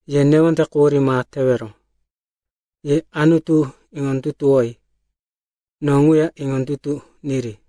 “Ye newonde quhurí ma tewero. Ye Anutu iŋondutuwoyi; no ŋuya iŋondutu niri.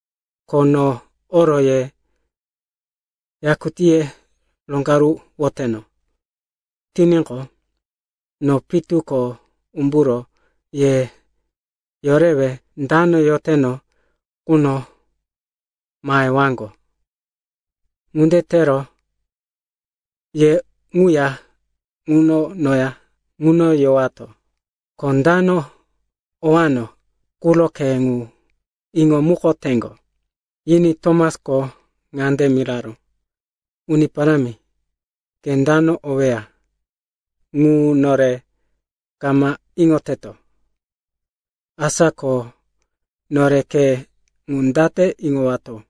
Ko no oro ye yakutíye roŋgaruwoteno tiníqo, no pitu ko umburo ye yorewe dano yoteno ŋuno mahewaŋgo. Ŋunde tero ye ŋuya ŋuno noya ŋuno yowato. Ko dano owano quro khe ŋu iŋomukoteŋgo.” Yiní Tomasko ŋande miraró, “Uni Parámi, ke dano oweya ŋu nore kama iŋoteto. Asa ko nore khe ŋu date iŋowato?”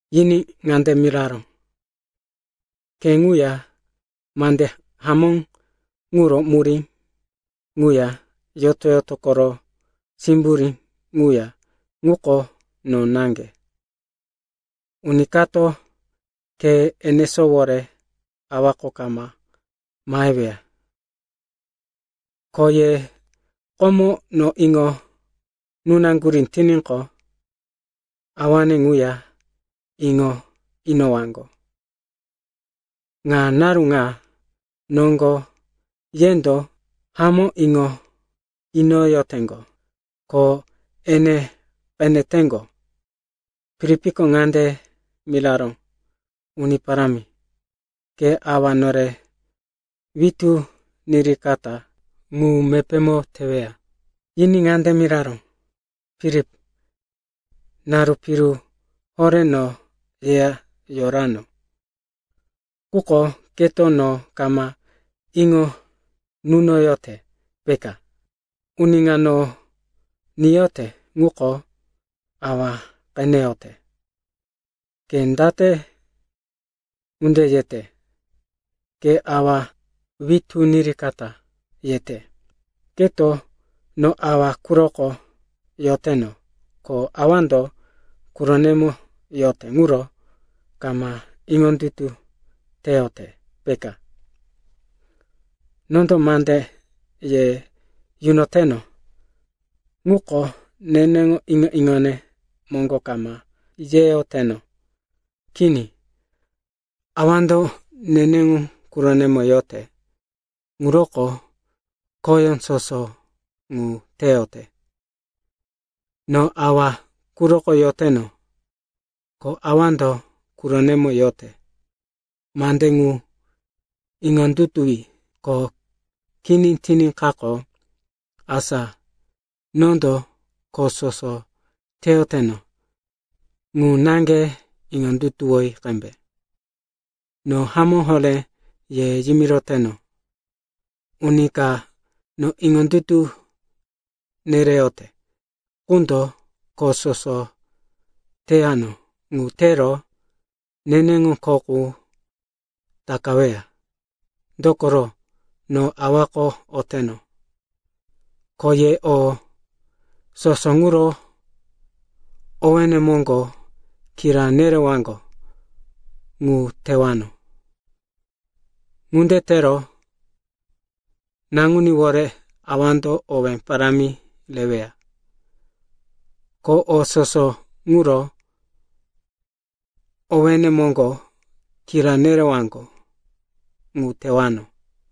Yiní ŋande miraró, “Khe ŋuya, mande hamó ŋuro murí ŋuya, yoto-yoto koro simburí ŋuya ŋuko no naŋge. Uni kato khe enesówore Awako kama maheweya. Ko ye komo no iŋo nunaŋgurí tiníqo, awane ŋuya iŋo inowaŋgo. Ŋa naru ŋa noŋgo yendo hamó iŋo inoyoteŋgo, ko ene qeneteŋgo.” Filipko ŋande miraró, “Uni Parámi, ke Awa nore witú nirikata ŋu mepémo teweya.” Yiní ŋande miraró, “Filip, naru piru horé no yeya yorano, quko keto no kama iŋo nunoyote, peka? Uni ka no niyote ŋuko Awa qeneyote. Ke date ŋunde yete, ‘Ke Awa witú nirikata,’ yete? Keto no Awa quroko yoteno ko Awando quronemo yote ŋuro kama iŋondutu teyote, peka? Nondo mande ye yunoyoteno ŋuko, neneŋo iŋo-iŋone moŋgo kama yeyoteno. Kini. Awando neneŋo quronemo yote, ŋuroko khoyó soso ŋu teyote. No Awa quroko yoteno, ko Awando quronemo yote. Mande ŋu iŋondutuwi. Ko kini tiníkaqo, asa nondo kho soso teyoteno ŋu naŋge iŋondutuwi qembe. No hamó horé ye yimiroteno, uni ka no iŋondutu nereyote ŋundo kho soso teyano ŋu tero neneŋo kho qu takaweya, dokoro, no Awako oteno. Ko ye o soso ŋuro owéne moŋgo kira nerewaŋgo ŋu tewano. Ŋunde tero Naŋuníwore Awando owé parámi reweya. Ko o soso ŋuro owéne moŋgo kira nerewaŋgo ŋu tewano.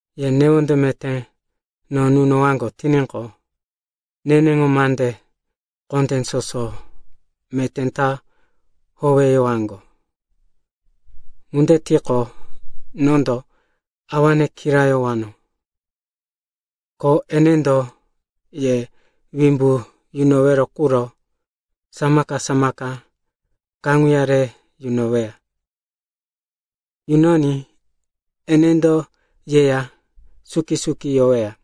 “Ye newonde meté no nunowaŋgo tiníqo, neneŋo mande kondé soso meté ta howeyowaŋgo. Ŋunde tiqo, nondo Awane kirayowano, ko enendo ye wimbu yunowero quro samaka-samaka kaŋuya re yunoweya. Yunoní enendo yeya suki-suki yoweya.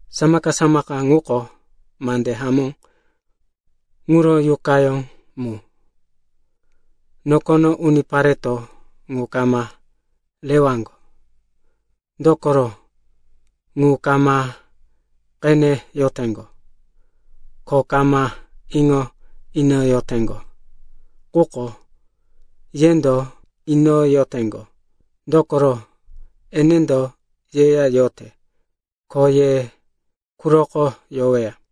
Samaka-samaka ŋuko mande hamó ŋuro Yuqayó mu. Nokono unipareto ŋu kama rewaŋgo, dokoro ŋu kama qeneyoteŋgo, ko kama iŋo inoyoteŋgo. Quko yendo iŋo inoyoteŋgo, dokoro enendo yeya yote ko ye quroko yoweya.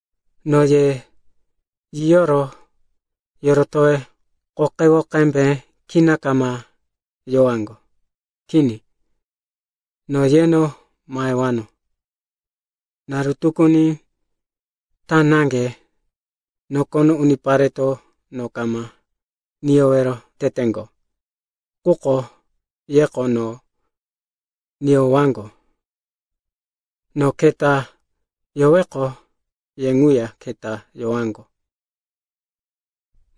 “No ye yiyoro yorotowe qoqewo qembe kina kama yowaŋgo. Kini. No yeno mahewano. Naru tukuni ta naŋge nokono unipareto no kama niyowero teteŋgo. Quko yeko no niyowaŋgo. No keta yoweqo, ye ŋuya keta yowaŋgo.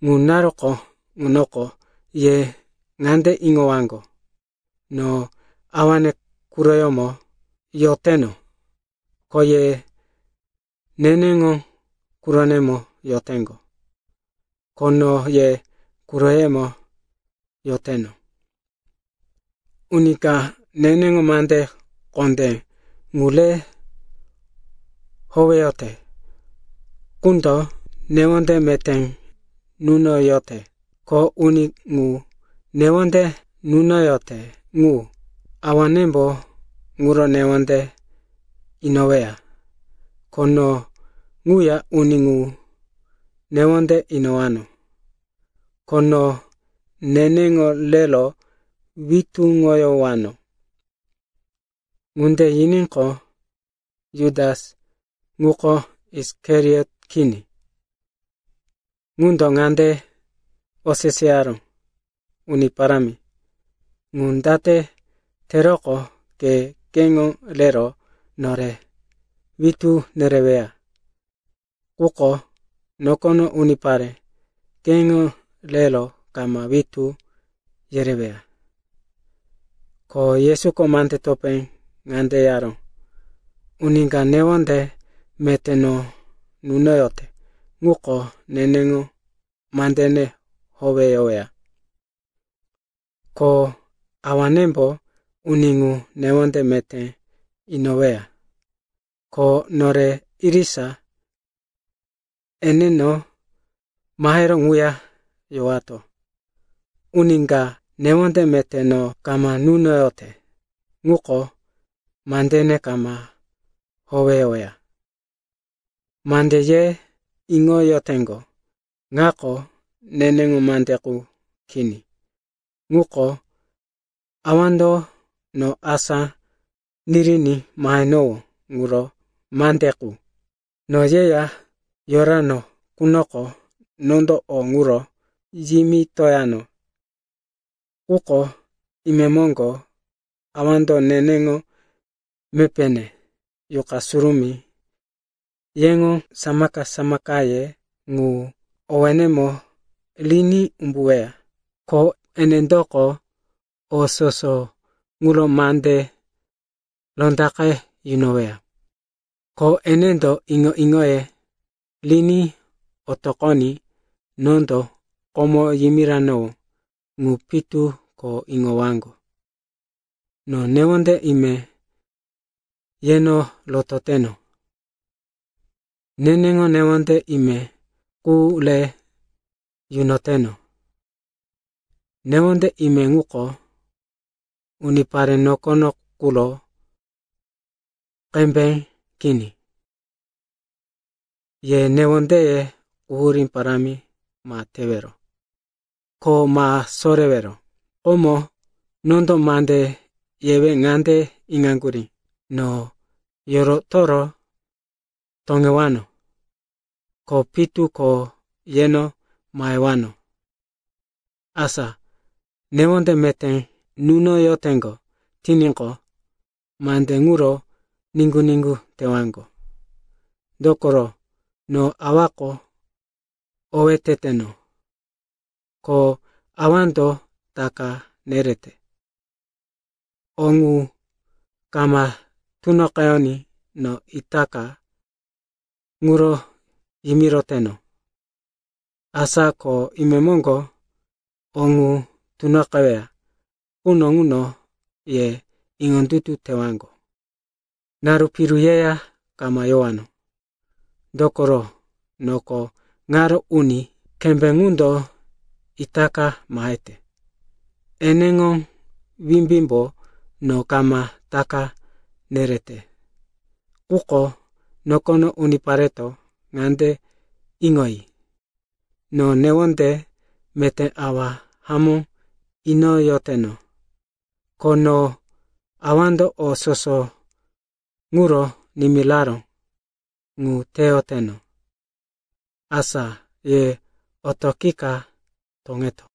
Ŋu naruko ŋunoko ye ŋande iŋowaŋgo, no Awane quroyómo yoteno, ko ye neneŋo quronemo yoteŋgo, ko no ye quroyemo yoteno. Uni ka neneŋo mande kondé ŋu re howeyote ŋundo newonde meté nunoyote. Ko uni ŋu newonde nunoyote ŋu, Awanembo ŋuro newonde inoweya. Ko no ŋuya uni ŋu newonde inowano, ko no neneŋo rero witúŋoyowano.” Ŋunde yiníqo, Jutas, ŋuko Isikariot kini, ŋundo ŋande oseseyaró, “Uni Parámi, ŋu date teroqo ke keŋo rero nore witú nereweya, quko nokono unipare keŋo rero kama witú yereweya?” Ko Yesuko mande topé ŋande yaró, “Uni ka newonde meté no nunoyote ŋuko neneŋo mandene howeyoweya. Ko Awanembo uni ŋu newonde meté inoweya. Ko nore irisa eneno mahero ŋuya yowato. Uni ka newonde meté no kama nunoyote ŋuko mandene kama howeyoweya. Mande ye iŋoyoteŋgo ŋako neneŋo mande qu kini. Ŋuko Awando no asá niriní mahenowó ŋuro mande qu. “No yeya yorano qunoko nondo o ŋuro yimitoyano. Quko imemoŋgo Awando neneŋo mepéne, Yuqa Surumí, yeŋo samaka-samakaye, ŋu owénemo riní umbuweya. Ko enendoko o soso ŋuro mande rondaqe yunoweya. Ko enendo iŋo-iŋoye riní otoqoní nondo komo yimiranowó ŋu pitu ko iŋowaŋgo. No newonde ime yeno rototeno. Neneŋo newonde ime qu re yunoteno. Newonde ime ŋuko, unipare nokono quro qembe kini. Ye newondeye quhurí parámi ma tewero, ko ma sorewero. “Komo nondo mande yewe ŋande iŋaŋgurí, ‘No yorotoro toŋewano, ko pitu ko yeno mahewano.’ Asa newonde meté nunoyoteŋgo tiníqo, mande ŋuro niŋgu-niŋgu tewaŋgo. Dokoro, no Awako owé teteno. Ko Awando taka nerete. O ŋu kama tunoqeyoní no itaka ŋuro yimiroteno. Asa ko imemoŋgo o ŋu tunoqeweya quno ŋuno ye iŋondutu tewaŋgo. “Naru piru yeya kama yewano, dokoro noko ŋaro uni kembé ŋundo itaka mahete. Eneŋo wimbímbo no kama taka nerete, quko nokono unipareto ŋande iŋoyi, no newonde meté Awa hamó inoyoteno. Ko no Awando o soso ŋuro nimiraró ŋu teyoteno. Asa ye otoqika toŋeto.